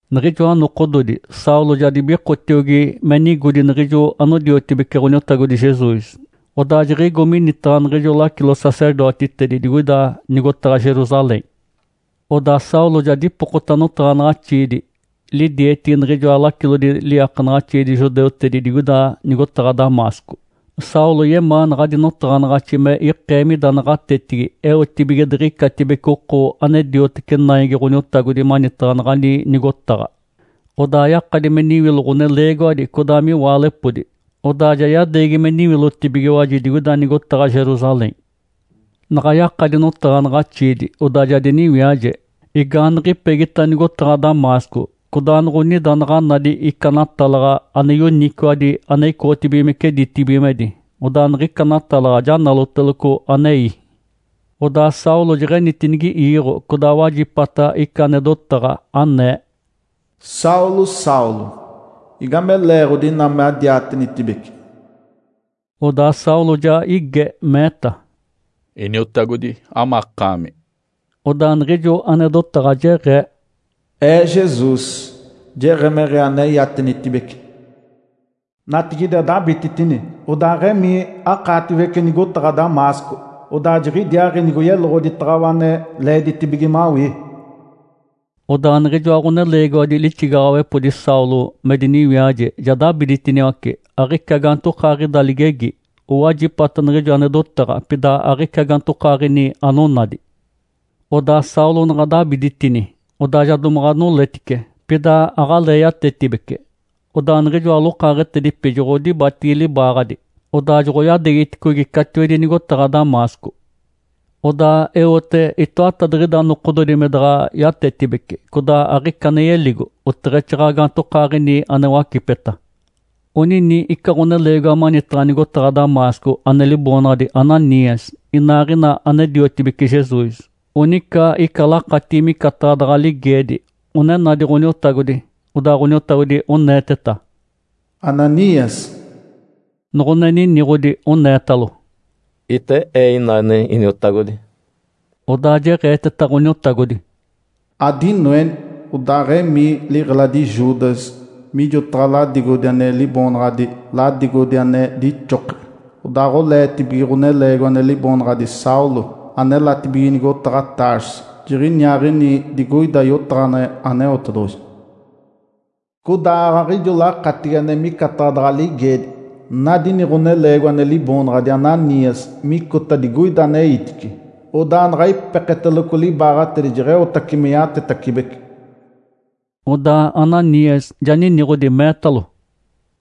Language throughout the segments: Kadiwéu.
Niɡ̶ijoa nokododi, Saulo ja dibikotiogi me nigodi niɡ̶ijo anodiotibece Ǥoniotagodi Jesus, odaa jiɡ̶igo minitaɡ̶a niɡ̶ijo lacilo-sacerdotitedi digoida nigotaɡ̶a Jerusalém. Odaa Saulo ja dipokota notaɡ̶anaɡ̶axiidi lidietigi niɡ̶ijoa lacilodi liiakanaɡ̶axiidi judeutedi digoida nigotaɡ̶a Damasco. Saulo yemaa naɡ̶adi notaɡ̶anaɡ̶axi me ikee mida naɡ̶atetigi eotibige diɡ̶icatibece oko ane diotece Naigi Ǥoniotagodi manitaɡ̶a naɡ̶ani nigotaɡ̶a, odaa yakadi me niwilo ɡ̶oneleegiwadi codaa miwaalepodi, odaa ja yadeegi me niwilotibigiwaji digoida nigotaɡ̶a Jerusalém. Naɡ̶a yakadi notaɡ̶anaɡ̶axiidi, odaa ja diniwiaje. Igaaniɡ̶ipegita nigotaɡ̶a Damasco, codaanoɡ̶onida naɡ̶a nadi ica natalaɡ̶a ane yoniciwadi ane icoɡ̶otibigimece ditibigimedi, odaa niɡ̶ica natalaɡ̶a ja naloteloco anei. Odaa Saulo jeɡ̶enitinigiiɡ̶o, codaa wajipata ica ane dotaɡ̶a, anee, “Saulo, Saulo! Igame leeɡ̶odi ina madiatenitibece?” Odaa Saulo ja ige, meeta, “Iniotagodi, amakaami?” Odaa niɡ̶ijo ane dotaɡ̶a jeɡ̶ee, “Ee Jesus, jeɡ̶emeɡ̶ee ane iatenitibece! Natigide adabititini, odaaɡ̶emii, akaatiwece nigotaɡ̶a Damasco. Odaa jiɡ̶idiaaɡ̶i nigoyeloɡ̶oditaɡ̶awa ane leeditibige mawii.” Odaa niɡ̶ijoa ɡ̶oneleegiwadi lixigaɡ̶awepodi Saulo me diniwiaje ja dabiditiniwace, aɡ̶ica gaantokaaɡ̶ida ligegi. Owajipata niɡ̶ijo ane dotaɡ̶a, pida aɡ̶ica gaantokaaɡ̶ini anonadi. Odaa Saulo naɡ̶a dabiditini, odaa ja domaɡ̶a noletice, pida aɡ̶alee yatetibece. Odaa niɡ̶ijoa lokaaɡ̶etedipi joɡ̶odibatigi libaaɡ̶adi, odaa joɡ̶oyadeegiticogi catiwedi nigotaɡ̶a Damasco. Odaa eote itoatadiɡ̶ida nokododi me daɡ̶a yatetibece, codaa aɡ̶ica ane yeligo, oteɡ̶exaaɡ̶aɡ̶a gaantokaaɡ̶ini ane wacipeta. Onini ica ɡ̶oneleegiwa manitaɡ̶a nigotaɡ̶a Damasco ane liboonaɡ̶adi Ananias, inaaɡ̶ina ane-diotibece Jesus. Onica ica lakatigi micataɡ̶a daɡ̶a ligeedi, one nadi Ǥoniotagodi. Odaa Ǥoniotagodi oneeteta, “Ananias!” Noɡ̶one niniɡ̶odi, oneetalo, “Ite ee inane, Iniotagodi.” Odaa jeɡ̶eeteta Ǥoniotagodi, “Adinoeni, odaaɡ̶emii liɡ̶eladi Judas mijotaɡ̶a ladigodi ane liboonaɡ̶adi ‘Ladigodi ane dixoke’. Odaaɡ̶oleetibige ɡ̶oneleegiwa ane liboonaɡ̶adi Saulo, anelatibige nigotaɡ̶a Tarso. Jiɡ̶iniaaɡ̶ini digoida yotaɡ̶aneɡ̶e Aneotedoɡ̶oji. Codaa aaɡ̶aɡ̶a ijo lakatigi ane micataɡ̶a daɡ̶a ligeedi, nadi ini ɡ̶oneleegiwa ane liboonaɡ̶adi Ananias micota digoida aneitice, odaa naɡ̶a ipeketeloco libaaɡ̶atedi jeɡ̶eotace me yatetacibece.” Odaa Ananias ja niniɡ̶odi, meetalo,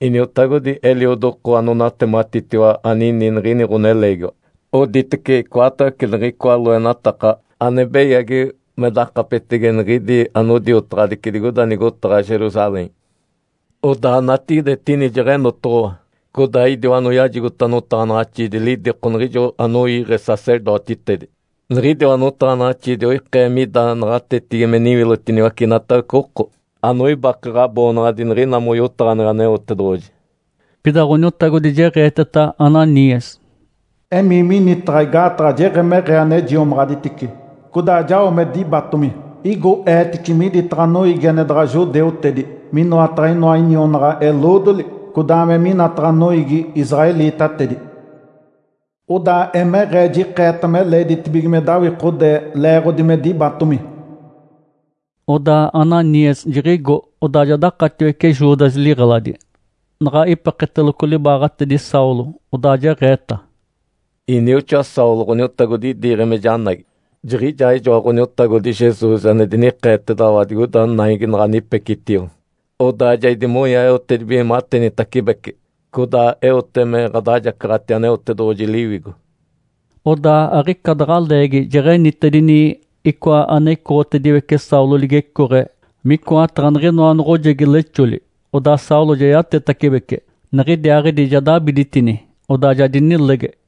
“Iniotagodi, eliodi oko onatematitiwa anini niɡ̶ini ɡ̶oneleegiwa. Oditece icoatawece niɡ̶icoa loenataka ane beyagi me dakapetege niɡ̶idi anodiotaɡ̶adici digoida nigotaɡ̶a Jerusalém. Odaa natigide etini jeɡ̶enotoɡ̶owa, codaa idiwa anoyajigota notaɡ̶anaɡ̶axiidi lidiko niɡ̶ijo anoiiɡ̶e sacerdotitedi. Niɡ̶idiwa notaɡ̶anaɡ̶axiidi oikee mida naɡ̶atetigi me niwilotiniwace inatawece oko anoibake Ǥaboonaɡ̶adi niɡ̶ina moyotaɡ̶aneɡ̶e Aneotedoɡ̶oji.” Pida Ǥoniotagodi jeɡ̶eeteta Ananias, “Emii minitaɡ̶a igaataɡ̶a jeɡ̶emeɡ̶ee ane jiomaɡ̶aditice, codaa jao me dibatomi. Igo eetici miditaɡ̶a noiigi ane daɡ̶a judeutedi, minoataɡ̶a inoa inionaɡ̶a-eloodoli, codaa me minataɡ̶a noiigi israelitatedi. Odaa emeɡ̶ee jikeeta me leeditibige me dawikode leeɡ̶odi me dibatomi.” Odaa Ananias jiɡ̶igo, odaa ja dakatiwece Judas liɡ̶eladi. Naɡ̶a ipeketeloco libaaɡ̶atedi Saulo, odaa jeɡ̶eeta, “Inioxoa Saulo, Ǥoniotagodi idiiɡ̶e me janagi. Jiɡ̶ijaaɡ̶ijoa Ǥoniotagodi Jesus ane dinikeetedaɡ̶awa digoida naigi naɡ̶a anipecitio. Odaa ja idimonya eotedibige matenitacibece, codaa eote me ɡ̶adajacaɡ̶ati Aneotedoɡ̶oji Liwigo.” Odaa aɡ̶ica daɡ̶a leegi jeɡ̶enitedini icoa ane icoɡ̶otediwece Saulo ligecooɡ̶e micoataɡ̶a niɡ̶inoa noɡ̶ojegi lexoli. Odaa Saulo ja yatetacibece. Niɡ̶idiaaɡ̶idi ja dabiditini, odaa ja dinilege.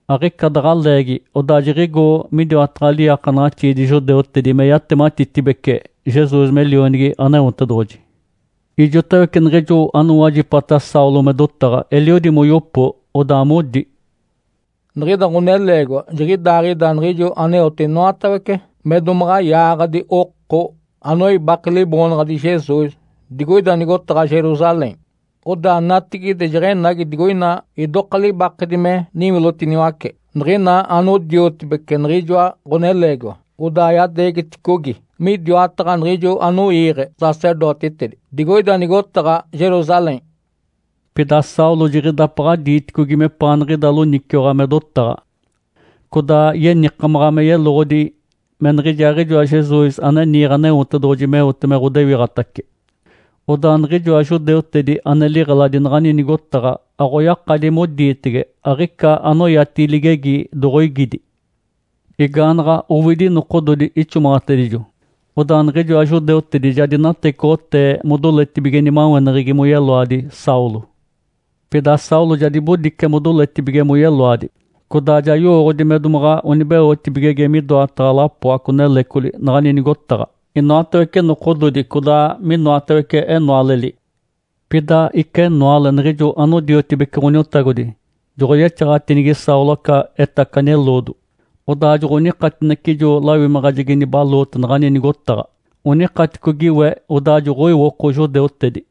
Aɡ̶ica daɡ̶a leegi odaa jiɡ̶igo midiwataɡ̶a liiakanaɡ̶axiidi judeutedi me yatematitibece Jesus me Lionigi Aneotedoɡ̶oji. Ijotawece niɡ̶ijo anowajipata Saulo me dotaɡ̶a eliodi moyopo, odaa modi, “Niɡ̶ida ɡ̶oneleegiwa jiɡ̶idaaɡ̶ida niɡ̶ijo aneote inoatawece me domaɡ̶a yaaɡ̶adi oko anoibake Liboonaɡ̶adi Jesus digoida nigotaɡ̶a Jerusalém. Odaa natigide jeɡ̶enagi digoina idoka libakedi me niwilotiniwace niɡ̶ina anodiotibece niɡ̶ijoa ɡ̶oneleegiwa, odaa yadeegiticogi midiwataɡ̶a niɡ̶ijo anoiiɡ̶e sacerdotitedi digoida nigotaɡ̶a Jerusalém.” Pida Saulo jiɡ̶idapaɡ̶a diiticogi mepaaniɡ̶ida loniciwaɡ̶a me dotaɡ̶a. Codaa yenikamaɡ̶a me yeloɡ̶odi me niɡ̶ijaaɡ̶ijoa Jesus ane niiɡ̶e Aneotedoɡ̶oji meote me ɡ̶odewiɡ̶atace. Odaa niɡ̶ijoa judeutedi ane liɡ̶eladi naɡ̶ani nigotaɡ̶a aɡ̶oyakadi modiitege, aɡ̶ica anoyatigi ligegi doɡ̶oigidi. Igaanaɡ̶a owidi nokododi ixomaɡ̶atedijo, odaa niɡ̶ijoa judeutedi ja dinatecoɡ̶otee modoletibige nimaweneɡ̶egi moyeloadi Saulo. Pida Saulo ja dibodice modoletibige moyeloadi. Codaa ja yowooɡ̶odi me domaɡ̶a onibeotibigege midoataɡ̶a lapoaco-nelecoli naɡ̶ani nigotaɡ̶a, inoatawece nokododi, codaa minoatawece enoaleli. Pida ica enoale niɡ̶ijo anodiotibece Ǥoniotagodi joɡ̶oyexaɡ̶atinigi Saulo aca etacani eloodo, odaa joɡ̶onikatinece ijo lawimaɡ̶ajegi nibaloote naɡ̶ani nigotaɡ̶a, onikatinicogi we, odaa joɡ̶oiwoko judeutedi.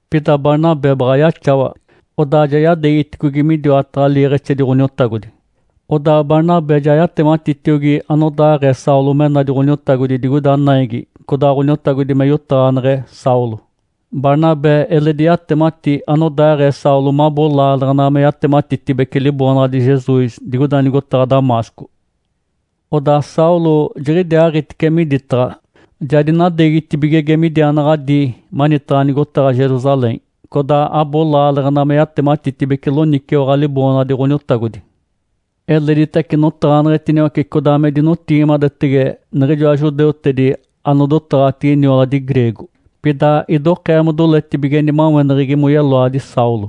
Pida Barnabé baɡ̶a yaxawa, odaa ja yadeegiticogi midiwataɡ̶a liiɡ̶exedi Ǥoniotagodi. Odaa Barnabé ja yatematitiogi anodaaɡ̶ee Saulo me nadi Ǥoniotagodi digoida naigi codaa Ǥoniotagodi me yotaɡ̶aneɡ̶e Saulo. Barnabé eledi yatemati anodaaɡ̶ee Saulo mabo laaleɡ̶ena me yatematitibece Liboonaɡ̶adi Jesus digoida nigotaɡ̶a Damasco. Odaa Saulo jiɡ̶idiaaɡ̶itice miditaɡ̶a, ja dinadeegitibigege midiaanaɡ̶a dii manitaɡ̶a nigotaɡ̶a Jerusalém, codaa abo laaleɡ̶ena me yatematitibece loniciwaɡ̶a Liboonaɡ̶adi Ǥoniotagodi. Eleditace notaɡ̶aneɡ̶etiniwace codaa me dinotigimadetege niɡ̶ijoa judeutedi anodotaɡ̶atigi nioladi greego, pida idokee modoletibige nimaweneɡ̶egi moyeloadi Saulo.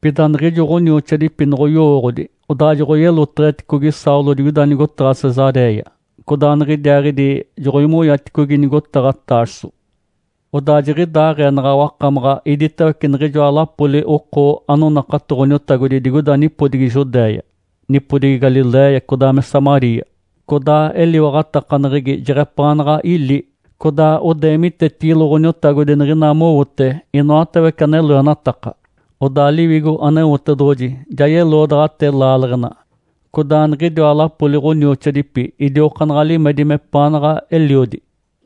Pida niɡ̶ijo ɡ̶onioxoadipi noɡ̶oyowooɡ̶odi, odaa joɡ̶oyeloteɡ̶eticogi Saulo digoida nigotaɡ̶a Cesaréia, codaa niɡ̶idiaaɡ̶idi joɡ̶oimonyaticogi nigotaɡ̶a Tarso. Odaa jiɡ̶idaaɡ̶ee naɡ̶a wakamaɡ̶a iditawece niɡ̶ijoa lapoli oko anonakato Ǥoniotagodi digoida nipodigi Judéia, nipodigi Galiléia, codaa me Samaria. Codaa eliwaɡ̶atakaneɡ̶egi jeɡ̶epaanaɡ̶a ili, codaa odeemitetigilo Ǥoniotagodi niɡ̶ina mowote inoatawece ane loenataka. Odaa Liwigo Aneotedoɡ̶oji ja yeloodaɡ̶atee laaleɡ̶ena, codaa niɡ̶idiwa lapoli ɡ̶onioxoadipi idiokaanaɡ̶a limedi mepaanaɡ̶a eliodi.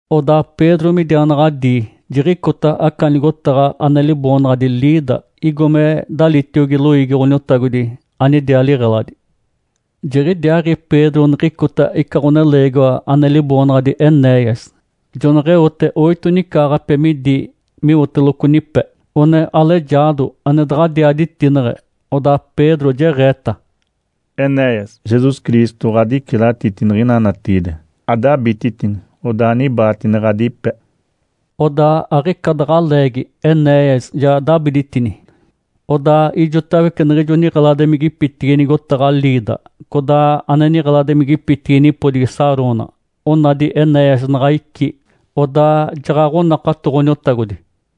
Odaa Pedro midiaanaɡ̶adii, jiɡ̶icota aca nigotaɡ̶a ane liboonaɡ̶adi Lida igo me dalitiogi loiigi Ǥoniotagodi anidiaa liɡ̶eladi. Jiɡ̶idiaaɡ̶i Pedro niɡ̶icota ica ɡ̶oneleegiwa ane liboonaɡ̶adi Enéias, joneɡ̶eote oito nicaaɡ̶ape midi miwooteloco nipe, one alejaado ane daɡ̶adiaa ditineɡ̶e. Odaa Pedro jeɡ̶eeta, “Enéias, Jesus Cristo ɡ̶adicilatiti niɡ̶ina natigide! Adabititini, odaa anibaatine ɡ̶adipe!” Odaa aɡ̶ica daɡ̶a leegi Enéias ja dabiditini. Odaa ijotawece niɡ̶ijo niɡ̶eladimigipitigi nigotaɡ̶a Lida codaa ane niɡ̶eladimigipitigi nipodigi Sarona onadi Enéias naɡ̶a icí, odaa jaɡ̶aɡ̶onakato Ǥoniotagodi.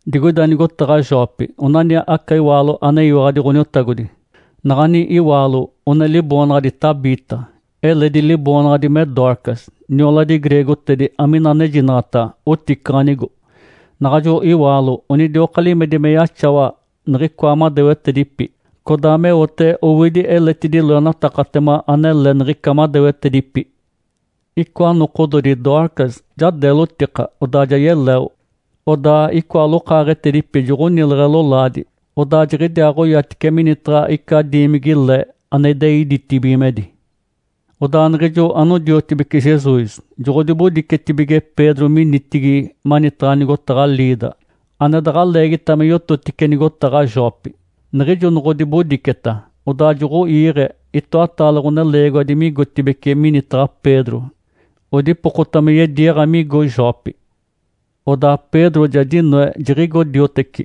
Digoida nigotaɡ̶a Jope onani aca iwaalo aneyiwaɡ̶adi Ǥoniotagodi. Naɡ̶ani iwaalo one liboonaɡ̶adi Tabita, eledi liboonaɡ̶adi me Dorcas, nioladi greegotedi amina anejinaɡ̶ata “Oticaɡ̶anigo”. Naɡ̶ajo iwaalo onidioka limedi me yaxawa niɡ̶icoa madewetedipi, codaa meote owidi eletidi loenatakatema anele niɡ̶ica madewetedipi. Icoa nokododi Dorcas ja deelotika, odaa ja yeleo. Odaa icoa lokaaɡ̶etedipi joɡ̶onileɡ̶e lolaadi, odaa jiɡ̶idiaaɡ̶oyatice minitaɡ̶a ica diimigi-le ane idei ditibigimedi. Odaa niɡ̶ijo anodiotibece Jesus joɡ̶odibodicetibige Pedro minitigi manitaɡ̶a nigotaɡ̶a Lida, ane daɡ̶a leegita me yototice nigotaɡ̶a Jope. Niɡ̶ijo noɡ̶odibodiceta, odaa joɡ̶oiiɡ̶e itoataale ɡ̶oneleegiwadi migotibeci minitaɡ̶a Pedro odipokota me yediiɡ̶a migo Jope. Odaa Pedro ja dinoe, jiɡ̶igo dioteci.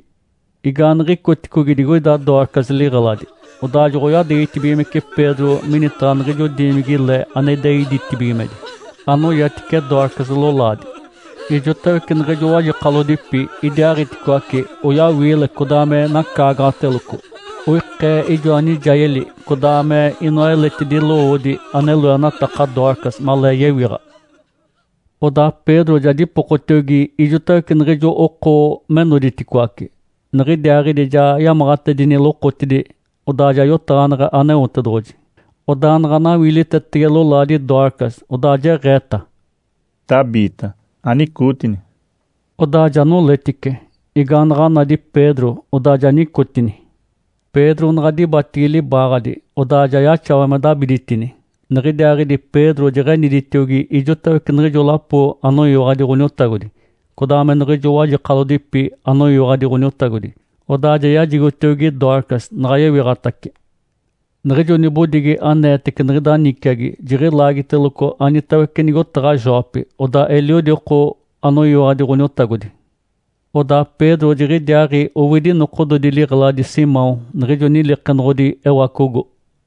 Igaaniɡ̶icoticogi digoida Dorcas liɡ̶eladi, odaa joɡ̶oyadeegitibigimece Pedro minitaɡ̶a niɡ̶ijo diimigi-le ane idei ditibigimedi, anoyatice Dorcas lolaadi. Ijotawece niɡ̶ijo wajekalodipi idiaaɡ̶iticoaci oyawiile codaa me nacaagaɡ̶ateloco. Oikee ijoa nijayeli codaa me inoa eletidi lowoodi ane loenataka Dorcas malee yewiɡ̶a. Odaa Pedro ja dipokotiogi ijotawece niɡ̶ijo oko me noditicoaci, niɡ̶idiaaɡ̶idi ja yamaɡ̶atedini lokotidi, odaa ja yotaɡ̶aneɡ̶e Aneotedoɡ̶oji. Odaa naɡ̶a nawiilitetege lolaadi Dorcas, odaa jeɡ̶eeta, “Tabita, anicootini!” Odaa ja noletice. Igaanaɡ̶a nadi Pedro, odaa ja nicotini. Pedro naɡ̶a dibatigi libaaɡ̶adi, odaa ja yaxawa me dabiditini. Niɡ̶idiaaɡ̶idi Pedro jeɡ̶eniditiogi ijotawece niɡ̶ijo lapo anoyiwaɡ̶adi Ǥoniotagodi, codaa me niɡ̶ijo wajekalodipi anoyiwaɡ̶adi Ǥoniotagodi, odaa ja yajigotiogi Dorcas naɡ̶a yewiɡ̶atace. Niɡ̶ijo nibodigi aneetece niɡ̶ida niciagi jiɡ̶ilaagiteloco anitawece nigotaɡ̶a Jope, odaa eliodi oko anoyiwaɡ̶adi Ǥoniotagodi. Odaa Pedro jiɡ̶idiaaɡ̶i owidi nokododi liɡ̶eladi Simão niɡ̶ijo nilikenoɡ̶odi ewacogo.